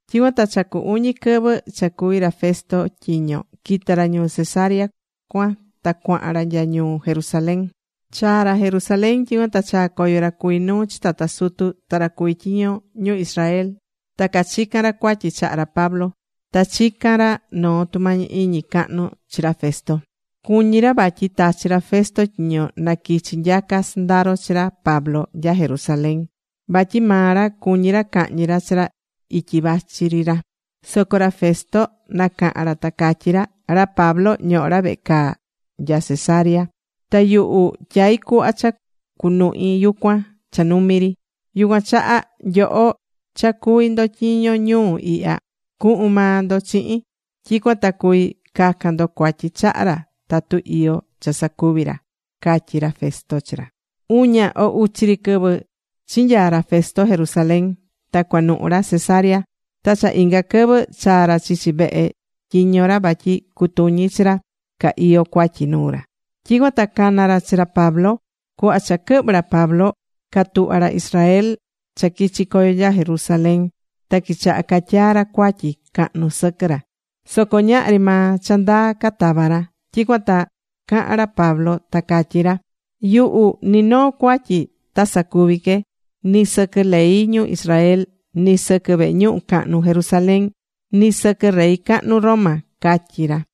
Tyicuan ta cha cu uñi quɨvɨ cha cuví ra Festo tyiño, quita̱ ra ñuu Cesarea cuan ta cuahan ra nya ñuu Jerusalén. Chaa̱ ra Jerusalén, tyicuan ta chaa̱ coyo ra cuví nuu chi tata sutu ta ra cuví tyiño ñu Israel ta cachica̱n ra cuatyi chaha ra Pablo. Ta chica̱n ra noo tumañi iñi cahnu chi ra Festo. Cuñí ra vatyi tachi ra Festo tyiño na quichi nyaca sɨndaro chi ra Pablo nya Jerusalén. Vatyi maa ra cuñí ra cahñi ra chi ra ityi vachi ri ra. Soco ra Festo nacaha̱n ra, ta catyí ra: ―Ra Pablo ñohó ra vehe caa nya Cesarea. Ta yuhu tyaí cuhva cha cunuhi yucuan cha numi ri. Yucuan chaha, nyoho cha cuví ndo tyiño ñuu ihya, cuhun maa ndo chihin. Tyicuan ta cuvi cacan ndo cuatyi chaha ra tatu iyó cha sacuvi̱ ra ―catyí ra Festo chi ra. Uña o uchi ri quɨvɨ chi nyaa ra Festo Jerusalén, ta cuanuhu̱ ra Cesarea. Ta cha inga quɨvɨ chaa̱ ra chichi vehe tyiño ra vatyi cutuñi chi ra ca iyó cuatyi nuu ra. Tyicuan ta cana̱ ra chi ra Pablo. Cuhva cha quɨhvɨ̱ ra Pablo, catuhva̱ ra Israel cha quichi̱ coyo nya Jerusalén, ta quichaha̱ catyaa ra cuatyi cahnu sɨquɨ ra. Soco ñahri maa cha ndaa catava̱ ra. Tyicuan ta caha̱n ra Pablo ta catyí ra: ―Yuhu ni noo cuatyi ta sacuvi que, ni sɨquɨ ley ñu Israel, ni sɨquɨ vehe ñuhu cahnu Jerusalén, ni sɨquɨ rey cahnu Roma ―catyí ra.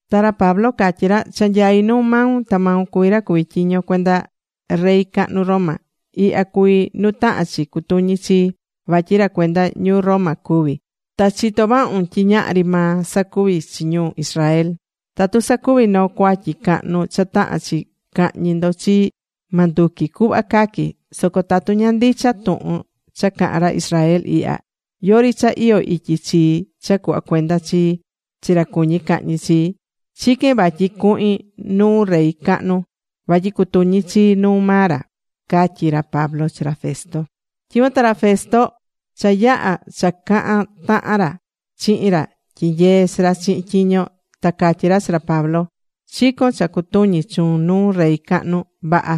Ta ra Pablo catyí ra: ―Cha nyaí nu maun. Ta maun cuví ra cuví tyiño cuenda rey cahnu Roma. Ihya cuví nu tahán chi cutuñi chií, vatyi ra cuenda ñuu Roma cuví. Ta chitó vahun tyi ñahri maa sacuvi̱ chi ñu Israel. Tatu sacuvi̱ noo cuatyi cahnu cha tahán chi cahñi ndo chii, ma nduqui cuhva caqui. Soco tatu ña ndicha tuhun cha cahán ra Israel ihya, yori cha iyó ityi chii cha cuhva cuenda chii chi ra cuñí cahñi chii. Chiquén vatyi cuhin nuu rey cahnu vatyi cutuñi chii nuu maa ra ―catyí ra Pablo chi ra Festo. Tyicuan ta ra Festo cha yaha̱ cha cahan tahan ra chihin ra tyinyeé chi ra chihin tyiño, ta catyí ra chi ra Pablo: ―Chicón cha cutuñi chuun nuu rey cahnu. Vaha.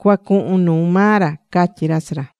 Cua cuhun nuu maa ra ―catyí ra chi ra.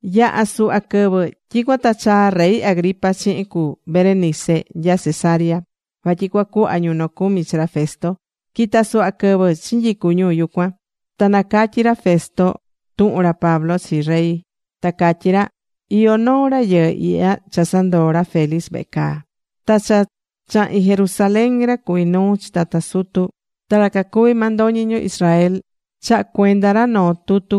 Yaha̱ suhva quɨvɨ, tyicuan ta chaa̱ rey Agripa chihin cu Berenice nya Cesarea, vatyi cuacuhva ñu nocumi chi ra Festo. Quita suhva quɨvɨ chinyicu ñu yucuan, ta nacatyi̱ ra Festo tuhun ra Pablo chi rey. Ta catyí ra: ―Iyó noo rayɨɨ ihya cha sandoo̱ ra Félix vehe caa. Ta cha chahi̱n Jerusalén, ra cuví nuu chi tata sutu, ta ra cacuví mandoñi ñu Israel chaha̱ cuenda ra noo tutu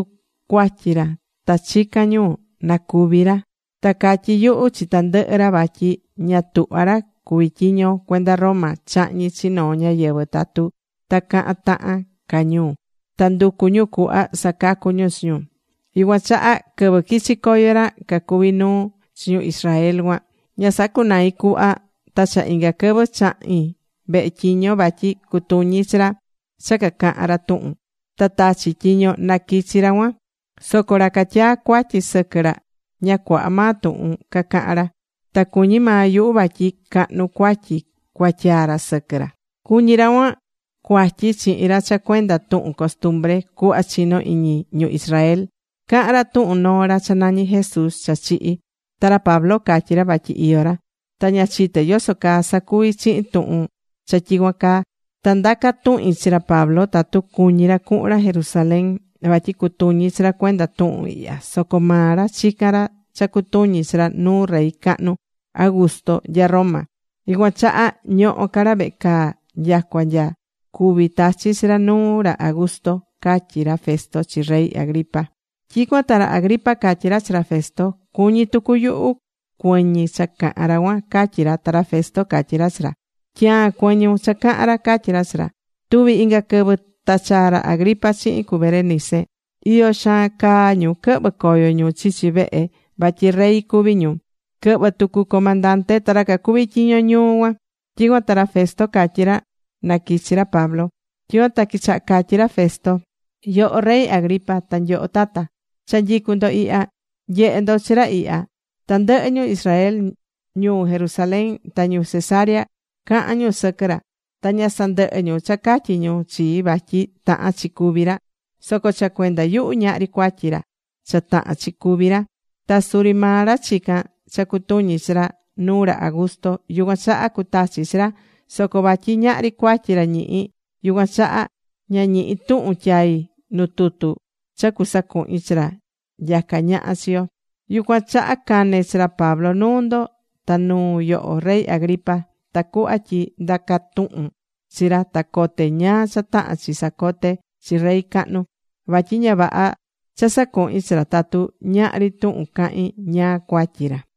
cuatyi ra, ta chicán ñu na cúvi ra. Ta catyi̱ yuhu chi tandɨhɨ ra vatyi ña tuhvá ra cuví tyiño cuenda Roma chahñi chi noo ñáyɨvɨ tatu ta cahan tahan ca ñu ta nducu ñu cuhva sacacu ñu chi ñu. Yucuan chaha, quɨvɨ quichi coyo ra cacuví nuu chi ñu Israel cuan, ña sacunai̱ cuhva. Ta cha inga quɨvɨ chahi̱n vehe tyiño vatyi cutuñi chi ra cha cacahán ra tuhun. Ta tachi̱ tyiño na quichi ra cuan. Soco ra catyaá cuatyi sɨquɨ ra, ña cuaha maa tuhun cacaha̱n ra. Ta cuñí maa yuhu vatyi cahnu cuatyi cuatyaa ra sɨquɨ ra. Cuñí ra cuan cuatyi chihin ra cha cuenda tuhun costumbre, cuhva chinó iñi ñu Israel. Cahán ra tuhun noo ra cha nañí Jesús cha chihi̱. Ta ra Pablo catyí ra vatyi iyó ra. Ta ña chité yoso caa sacuvi chihin tuhun cha tyicuan caa, ta ndaca̱ tuhin chi ra Pablo tatu cuñí ra cuhun ra Jerusalén, vatyi cutuñí chi ra cuenda tuhun ihya. Soco maa ra chicán ra cha cutuñi chi ra nuu rey cahnu Augusto nya Roma. Yucuan chaha ñohó ca ra vehe caa nyacua nya cuví tachi chi ra nuu ra Augusto ―catyí ra Festo chi rey Agripa. Tyicuan ta ra Agripa catyí ra chi ra Festo: ―Cuñí tucu yuhu cuɨñi cha cahán ra cuan ―catyí ra. Ta ra Festo catyí ra chi ra: ―Tyaan cuɨñun cha cahán ra ―catyí ra chi ra. Tuvi̱ inga quɨvɨ ta chaa̱ ra Agripa chihin cu Berenice. Iyo xaan caa ñu quɨhvɨ̱ coyo ñu chichi vehe vatyi rey cuví ñu. Quɨhvɨ̱ tucu comandante ta ra cacuví tyiño ñuu cuan. Tyicuan ta ra Festo catyí ra na quichi ra Pablo. Tyicuan ta quichaha catyí ra Festo: ―Yoho Rey Agripa, ta nyoho tata, cha nyicu ndo ihya. Nye̱he ndo chi ra ihya. Tandɨhɨ ñu Israel ñuu Jerusalén ta ñu Cesarea cahan ñu sɨquɨ ra. Ta ña sandɨhɨ́ ñu cha catyí ñu chii vatyi tahán chi cúvi ra. Soco cha cuenda yuhu ñahri cuatyi ra cha tahán chi cúvi ra. Ta suri maa ra chicán cha cutuñi chi ra nuu ra Augusto. Yucuan chaha cutachi chi ra. Soco vatyi ñahri cuatyi ra ñihí, yucuan chaha ña ñihi̱ tuhun tyai nu tutu cha cusacuhin chi ra nyacá ñaha chi yo. Yucuan chaha cane̱ chi ra Pablo nuu ndo, ta nuu yoho Rey Agripa, tacuhva tyi ndaca tuhun chi ra ta cote ñáá cha tahán chi sacote chi rey cahnu. Vatyi ña vaha cha sacuhín chi ra tatu ñahri tuhun cahín ñáá cuatyi ra.